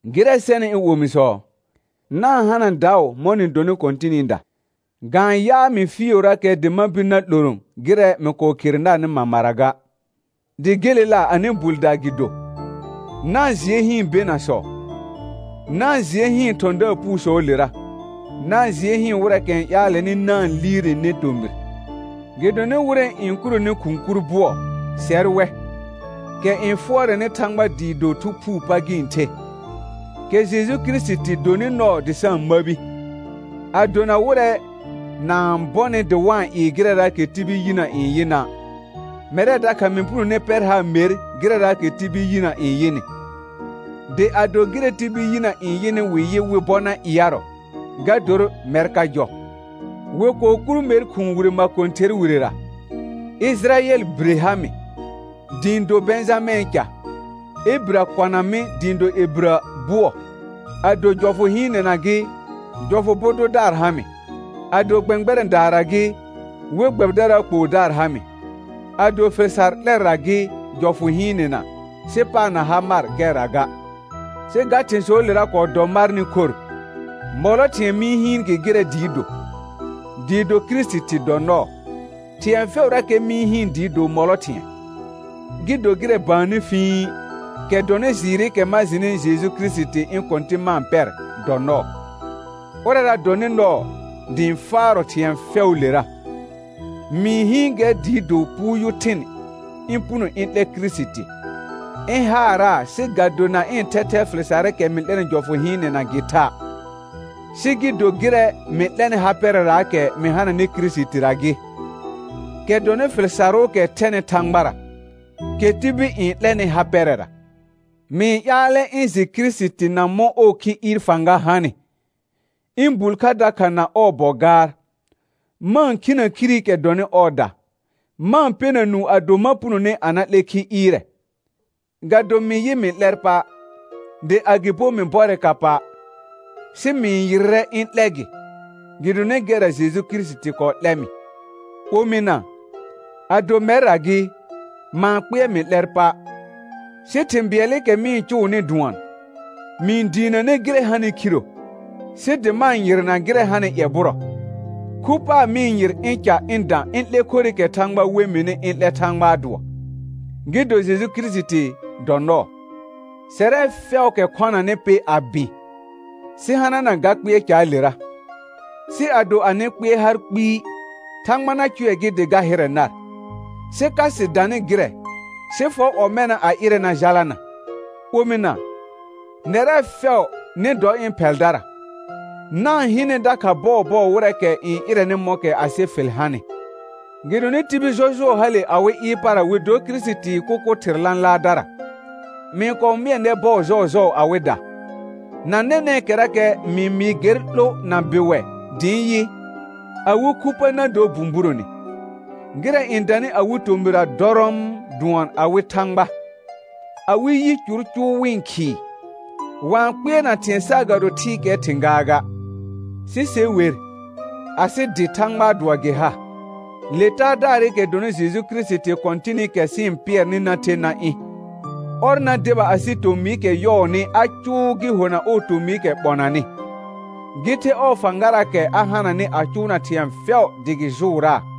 Gɩrɛ sɛnɩ ɩ̃ omisɔ, na-n hana daʋ mɔ̃ nɩ donɩ Kɔ̃tɩnɩda. Ga-n yaa mɩ fɩɩʋrakɛ dɩ ma bir na 'loro gɩrɛ mɩ kɔɔ khere narnɩ mamara ga, dɩ gelela anɩ bulda gɩ do. Na-n jɩɛ hɩɩn benasɔ, na-n jɩɛ hɩɩn thɔ̃daar puusɔɔlera, na-n jɩɛ hɩɩn wɩrɛɛkɛ n ƴaalɛnɩ na-n liirene tomɩr. Gɩdonɩ wɩrɛ n kuroni khʋ̃ kur bʋɔ, sɛr wɛ, kɛ n fʋɔrɛnɩ Thãgba dɩɩ do Thu Phuu pa gɩ-n the, kɛ Jeju Kirisiti donɩ nɔɔ dɩ sa-n məbi, a dona wɩrɛ na-n bɔnɩ dɩ wa-n ɩɩ gɩrɛraakɛ tibil yinə n yɩna'. Mɛrɛ dakha mɩ punone pɛr haar mer gɩrɛraakɛ tibil yinə n yɩnɩ, dɩ ado gɩrɛ tibil yinə n yɩnɩ wɩ yɩ wɩ bɔ na ɩarɔ, ga dor mɛr ka jɔ: Wɩ kɔɔ kur mer khʋ̃ʋ wire makõther wirera, Ɩjɩrayɛl bire ha mɩ, dɩ ɩ̃ do Bɛ̃jamɛ̃ɛ ca, Ebirə kɔna mɩ dɩ ɩ̃ do Ebirə bʋɔ; ado jɔfʋ hɩɩnɛna gɩ, jɔfʋ bʋ dʋdaar ha mɩ, ado gbɛ̃gbɛrɛ̃daara gɩ, we gbɛbɩdaraa kpoodaar ha mɩ, ado fɩl sar 'lɛrra gɩ jɔfʋ hɩɩnɛna, sɩ paar na ha mar gɛrra ga. Sɩ ga thɩ̃sɔɔlera kɔɔ dɔ marnɩ khor, mɔlɔ thɩ̃ɛ mɩ-n hɩɩn gɩ gɩrɛ dɩɩ do, dɩɩ do Kirisiti dɔ nɔɔ. Thɩ̃ɛ fɛʋrakɛ mɩ-n hɩɩn dɩɩ do mɔlɔ thɩ̃ɛ, gɩ do gɩrɛ baannɩ fĩi, kɛ dɔnɩ jɩɩrɩkɛ ma jɩnɩ Jeju Kirisiti ɩ̃ Kɔ̃tɩ̃ ma-n pɛr, dɔ nɔɔ; ʋrɛra dɔnɩ nɔɔ dɩ ɩ̃ faarɔ thɩ̃ɛ fɛʋʋlera. Mɩ-n hɩɩn gɛr dɩɩ do puuyʋ thɩn ɩ̃ puno ɩ̃ 'lɛ Kirisiti, ɩ̃ haaraa sɩ ga do na ɩ̃ thɛthɛɛ fɩl sarɩkɛ mɩ 'lɛnɩ jɔfʋ hɩɩnɛna gɩ tha', sɩ gɩ do gɩrɛ mɩ 'lɛnɩ ha pɛrɛraakɛ mɩ hananɩ Kirisitira gɩ, kɛ dɔnɩ fɩl sarʋʋkɛ thɛnɩ Thãgbara, kɛ tibil n 'lɛnɩ ha pɛrɛra. Mɩ-n ƴaalɛ ɩ̃ jɩ Kirisiti na mɔ̃ ɔɔ khi ɩɩr fãga hanɩ, ɩ̃ bul kha dakha na ɔɔ bɔ gaar, ma-n khinə khirikɛ dɔnɩ ɔɔda, ma-n pɛna nũu ado ma punone a na 'lɛ khi ɩɩrɛ. Ga do mɩ yɩ mɩ 'lɛr pa', dɩ agɩbo mɩ bɔrɛ ka pa', sɩ mɩ-n yɩrrɛ ɩ̃ 'lɛ gɩ, gɩdonɩ gɛrra Jeju Kirisiti kɔɔ 'lɛ mɩ. Omɩna, ado mɛrra gɩ, ma-n kpɩɛr mɩ 'lɛr pa'; sɩ thɩ̃ bɩɛlɩkɛ mɩ-n cʋʋnɩ dʋɔn: Mɩ-n diinəne gɩrɛ hanɩ khiro, sɩ dɩ ma-n yɩrna gɩrɛ hanɩ ƴɛbʋrɔ. Khu paar mɩ-n yɩr ɩ̃ ca ɩ̃ dã ɩ̃ 'lɛ khorɩkɛ Thãgba n we mɩnɩ ɩ̃ 'lɛ Thãgbaa dʋɔ, gɩ do Jeju Kirisiti dɔ nɔɔ. Sɛrɛ fɛʋʋkɛ khɔnanɩ pɩ a bɩ̃, sɩ hanana ga kpɩɛr caalera, sɩ ado anɩ kpɩɛr har kpɩɩ, Thãgba na cʋɛ gɩ dɩ ga hɩrɛ nar. Sɩ ka sɩ danɩ gɩrɛ, sɩ fɔ ɔmɛna a ɩrɛ na jalana. Omɩna, nɛrɛ fɛʋ nɩ dɔ ɩ̃ phɛldara, na-n hɩnɛ dakha bɔɔbɔɔ wɩrɛɛkɛ n ɩrɛnɩ mɔ̃kɛ asɩ fɩl hanɩ. Gɩdonɩ tibil jɔjʋɔ hale awɩ ɩɩr para wɩ dor Kirisitii kʋkʋ thɩr lãlaardara; mɩ-n kɔɔ mɩɛ nɛr bɔɔ jɔɔjɔɔ awɩda, na nɛnɛ̃kɛrakɛ mɩ-n mɩɩ gɛr 'lo na bɩwɛ dɩ ɩ̃ yɩ: Awɩ khu pa na dor bũburone, gɩrɛ n danɩ awɩ tomɩra dɔrɔɔm dʋɔn awɩ thãgba, awɩ yicur cʋʋ wɩ-n khɩɩ, wa-n kpɩɛrna thɩ̃ɛ saagado thɩɩkɛɛ thɩ̃ gaaga. Sɩ se wer, asɩ dɩ Thãgbaa dʋɔ gɩ ha, le Taadaarɩkɛ dɔnɩ Jeju Kirisiti Kɔ̃tɩnɩkɛ sɩ-n pɩɛrnɩ na the na ɩ̃. Ɔr na deba asɩ tomɩɩkɛ yɔɔnɩ a cʋʋ gɩ hona ɔɔ tomɩɩkɛ ɓɔnanɩ, gɩ the ɔɔ fãgaraakɛ a hananɩ a cʋʋna thɩ̃ɛ fɛʋ dɩ gɩ jʋʋraa.